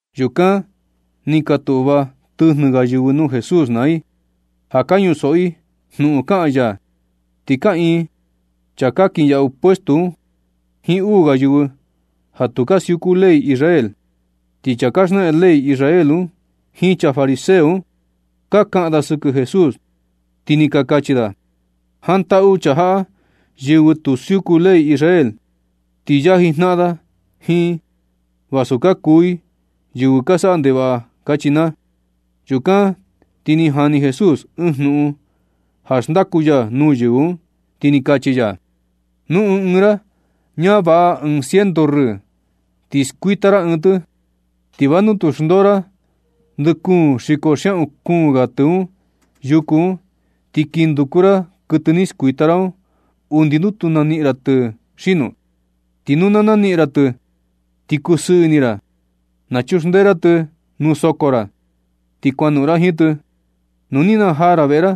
Yukan ni ka tuꞌva tɨjnɨ ga yɨvɨ nuu Jesús naa i ja ka ñusoꞌo i jnuꞌun kaꞌan ya. Ti kaꞌiin chaa ka kinyaꞌu puesto un jiin uu ga yɨvɨ ja tu ka siuku ley Israel. Ti chaa ka xnaꞌan ley Israel un jiin chaa fariseo un ka kaꞌan da sɨkɨ Jesús, ti ni ka kachi da: ―Jantaꞌu chaa jaꞌa yɨvɨ tu siuku ley Israel, ti yaji jnaꞌan da jiin i vasu ka kuu i yɨvɨ ka saꞌa ndevaꞌa ―kachi naa. Yukan ti ni jani Jesús ɨɨn jnuꞌun ja xndaku ya nuu yɨvɨ un, ti ni kachi ya: ―Nu ɨɨn ɨɨn ra ñavaꞌa ɨɨn ciento rɨɨ, ti skuita ra ɨɨn tɨ, ¿ti va nu tu xndoo ra ndɨꞌɨ kuun xiko xiaꞌun kuu ga tɨ un yuku un, ti kin nunduku ra kuɨtɨ ni skuita ra un undi nu tu naniꞌin ra tɨ xino? Ti nu na naniꞌin ra tɨ, ti kusɨɨ ini ra, nachuxndee ra tɨ nuu soko ra, ti kuanoꞌon ra jiin tɨ. Nu ni najaa ra veꞌe ra,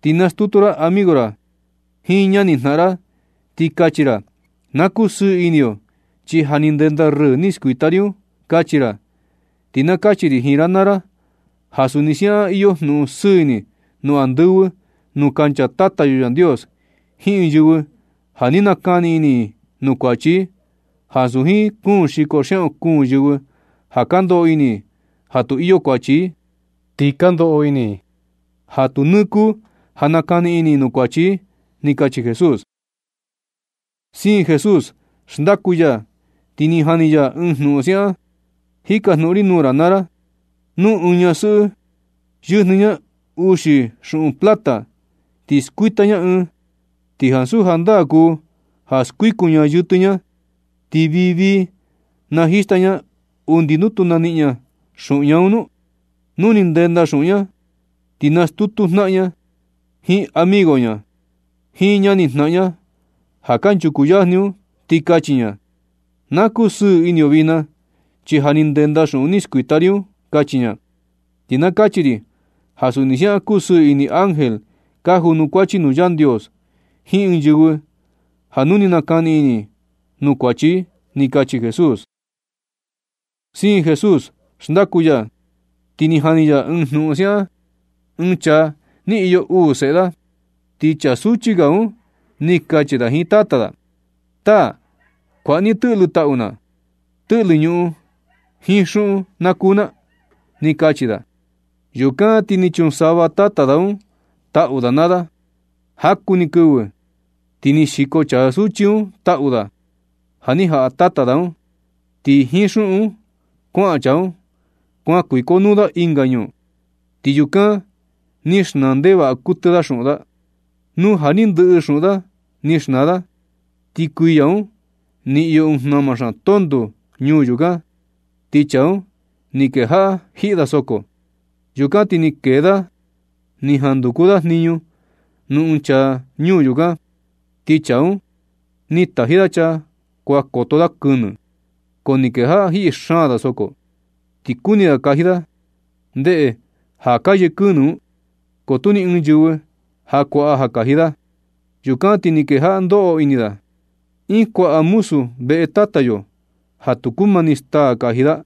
ti nastutu ra amigo ra jiin ñanijnaꞌan ra, ti kachi ra: “Na kusɨɨ ini yo, chi ja ni ndenda rɨɨ ni skuita ri un”, kachi ra. Ti na kachi ri jiin ra naa ra ja suni siaꞌan iyo jnuꞌun sɨɨ ini nuu andɨvɨ nuu kancha Tata yo Yandios jiin ɨɨn yɨvɨ ja ni nakani ini i nuu kuachi i, ansu jiin kuun xiko xiaꞌun kuun yɨvɨ ja ka ndoꞌo ini i ja tu iyo kuachi i, ti ka ndoꞌo ini i ja tu nɨɨ kuu ja nakani ini i nuu kuachi i ―ni kachi Jesús. Siin Jesús xndaku ya, ti ni jani ya ɨɨn jnuꞌun siaꞌan: ―Jikajnuꞌun ri nuu ra naa ra. ¿Nu ɨɨn ñasɨꞌɨ yɨjnɨ ña uxi xuꞌun plata ti skuita ña ɨɨn, xi ansu jandaa kuu ja skuikun ña yɨtɨ ña, ti vii vii najista ña undi nuu tu naniꞌin ña xuꞌun ña nu? Nu ni ndenda xuꞌun ña un, ti nastutu jnaꞌan ña, jiin amigo ña, jiin ñanijnaꞌan ña ja kanchuku yajni un, ti kachi ña: “Na kusɨɨ ini yo vijna, chi ja ni ndenda xuꞌun ni skuita ri un”, kachi ña. Ti na kachi ri ja suni siaꞌan kusɨɨ ini ángel ka junukuachi nuu Yandios jiin ɨɨn yɨvɨ, ja nu ni nakani ini i nuu kuachi i ―ni kachi Jesús. Siin Jesús xndaku ya, ti ni jani ya ɨɨn jnuꞌun siaꞌan: ―Ɨɨn chaa ni iyo uu seꞌe da, ti chaa suchi ga un ni kachi da jiin tata da: “Taa, kuaꞌa ni tɨꞌlɨ taꞌu na, tɨꞌlɨ ñuꞌun jiin xuꞌun na kuu na”, ni kachi da. Yukan ti ni chunsava tata da un taꞌu da naa da. Jaku ni kɨvɨ, ti ni xiko chaa suchi un taꞌu da ja ni jaꞌa tata da un, ti jiin xuꞌun un kuaꞌan chaa un, kuan kuikonuu da ɨnga ñuu, ti yukan ni xnaa ndevaꞌa kuɨtɨ da xuꞌun da. Nu ja ni ndɨꞌɨ xuꞌun da ni xnaa da, ti kuiya un ni iyo ɨɨn jnama xaan tonto ñuu yukan, ti chaa un ni kejaꞌa jiꞌi da soko. Yukan ti ni kee da ni jan nduku da jniñu nuu ɨɨn chaa ñuu yukan, ti chaa un ni taji da chaa kuan koto da kɨnɨ. Ko ni kejaꞌa jiꞌi xaan da soko, ti kuni da kaji da, ndeꞌe da ka yee kɨnɨ un, ko tu ni ɨɨn yɨvɨ ja kuaꞌa ja kaji da. Yukan ti ni kejaꞌa da ndoꞌo ini da: Iin kuaꞌa muzu veꞌe tata yo ja tu kumani staa kaji da,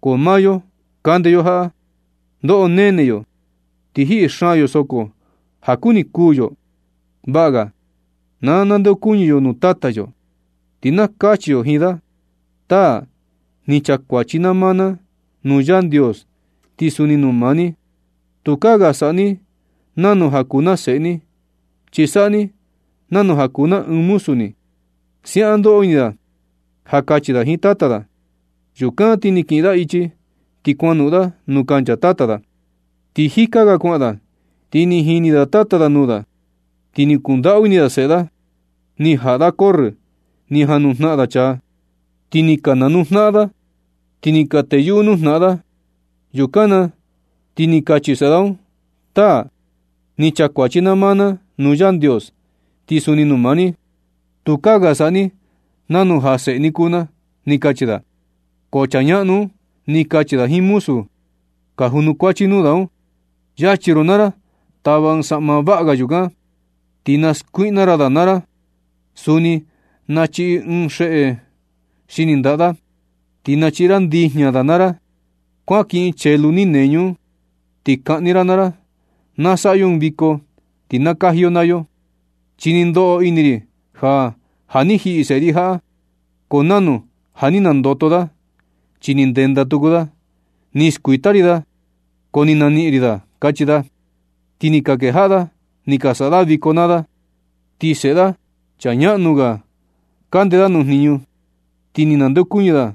ko maa yo, kande yo jaꞌa, ndoꞌo nene yo ti jiꞌi xaan yo soko ja kuni kuū yo. Vaꞌa ga na nandeokuñɨ yo nuu tata yo, ti na kachi yo jiin da: Taa, ni chaa kuachi na maa na nuu Yandios, ti suni nuu maa ni. Yukaa ga saꞌa ni nanu ja kuu na seꞌe ni, chi saꞌa ni nanu ja kuu na ɨɨn muzu ni. Siaꞌan ndoꞌo ini da ja kachi da jiin tata da. Yukan ti ni kiꞌin da ichi, ti kuanoꞌon da nuu kancha tata da. Ti jika ga kuaꞌan da, ti ni jini tata da nuu da, ti ni kundaꞌu ini da seꞌe da. Ni jaꞌa da corrɨ, ni janujnaꞌan da chaa, ti ni ka nanuu janaꞌan da, ti ni ka teyuꞌu nuu jnaꞌan da. Yukan na ti ni kachi seꞌe da un: “Taa, ni chaa kuachi na maa na nuu Yandios, ti suni nuu maa ni. Tukaa ga saꞌa ni nanu ja seꞌe ni kuu na”, ni kachi da. Ko chaa ñaꞌnu un, ni kachi da jiin muzu da ka junukuachi nuu da un: “Yachi ro naa ra, tava ɨɨn saꞌma vaꞌa ga yukan, ti na skuiꞌna ra da naa ra. Suni nachiꞌi ɨɨn xeꞌe xini ndaꞌa da, ti nachiꞌi ra ndijña da naa ra. Kuan kiꞌin chelu ni neñu un, ti kaꞌni ra naa ra. ¡Na saꞌa yo ɨɨn viko, ti na kaji yo naa yo! Chi ni ndoꞌo ini ri ja, ja ni jiꞌi seꞌe ri jaꞌa, ko nanu ja ni nandoto da, chi ni ndenda tuku da. Ni skuita ri da, ko ni naniꞌin ri da”, kachi da. Ti ni ka kejaꞌa da ni ka saꞌa da viko naa da. Ti seꞌe da chaa ñaꞌnu ga, kande da nuu jniñu, ti nu ni nandeokuñɨ da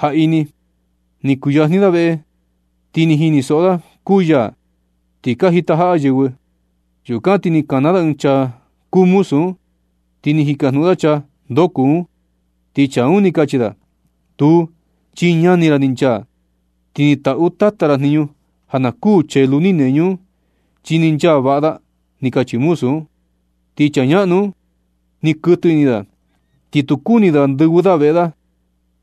jaꞌi ni, ni kuyajni da veꞌe, ti ni jinisoꞌo da kuu yaa, ti ka jitajaꞌa yɨvɨ. Yukan ti ni kana da ɨɨn chaa kuu muzu un, ti ni jikajnuꞌun da chaa ndoo kuu un. Ti chaa un ni kachi da: “Tuu, chi ñani ra ni nchaa, ti ni taꞌu tata ra jniñu ja na kuu chelu ni neñu un, chi ni nchaa vaꞌa da”, ni kachi muzu un. Ti chaa ñaꞌnu un ni kuɨtɨ ini da, ti tu kuni da ndɨvɨ da veꞌe da.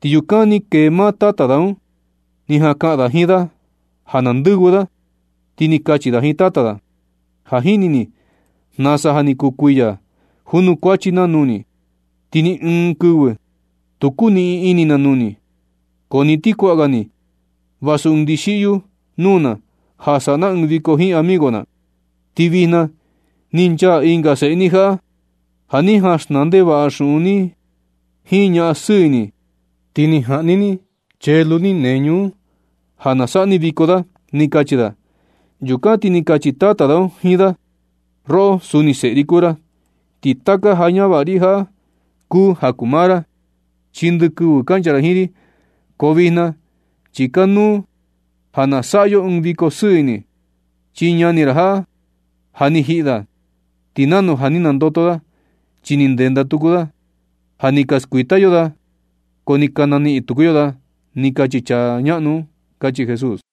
Ti yukan ni kee maa tata da un, ni jan kaꞌan da jiin da ja na ndɨvɨ da. Ti ni kachi da jiin tata da: “Ja jini ni nasa ja ni kuu kuiya junukuachi na nuu ni, ti ni ɨɨn kɨvɨ tu kuniꞌin ini na nuu ni, ko ni ti kuaꞌa ga ni vasu ɨɨn ndixiꞌyu nuu na ja saꞌa na ɨɨn viko jiin amigo na. Ti vijna ni nchaa ɨnga seꞌe ni jaꞌa ja ni jaꞌan xnaa ndevaꞌa xuꞌun ni jiin ñaꞌan sɨɨ ini, ti ni jaꞌni ni chelu ni neñu un ja na saꞌa ni viko da”, ni kachi da. Yukan ti ni kachi tata da un jiin da: “Roꞌo, suni seꞌe ri kuu ra, ti taka ja ñavaꞌa ri jaꞌa kuu ja kuu maa ra, chi ndɨ kɨvɨ kancha ra jiin ri. Ko vijna chi kanuu ja na saꞌa yo ɨɨn viko sɨɨ ini, chi ñani ra jaꞌa, ja ni jiꞌi da, ti nanu ja ni nandoto da chi ni ndenda tuku da. Ja ni ka skuita yo da, ko ni ka naniꞌin tuku yo da”, ni kachi chaa ñaꞌnu un ―kachi Jesús.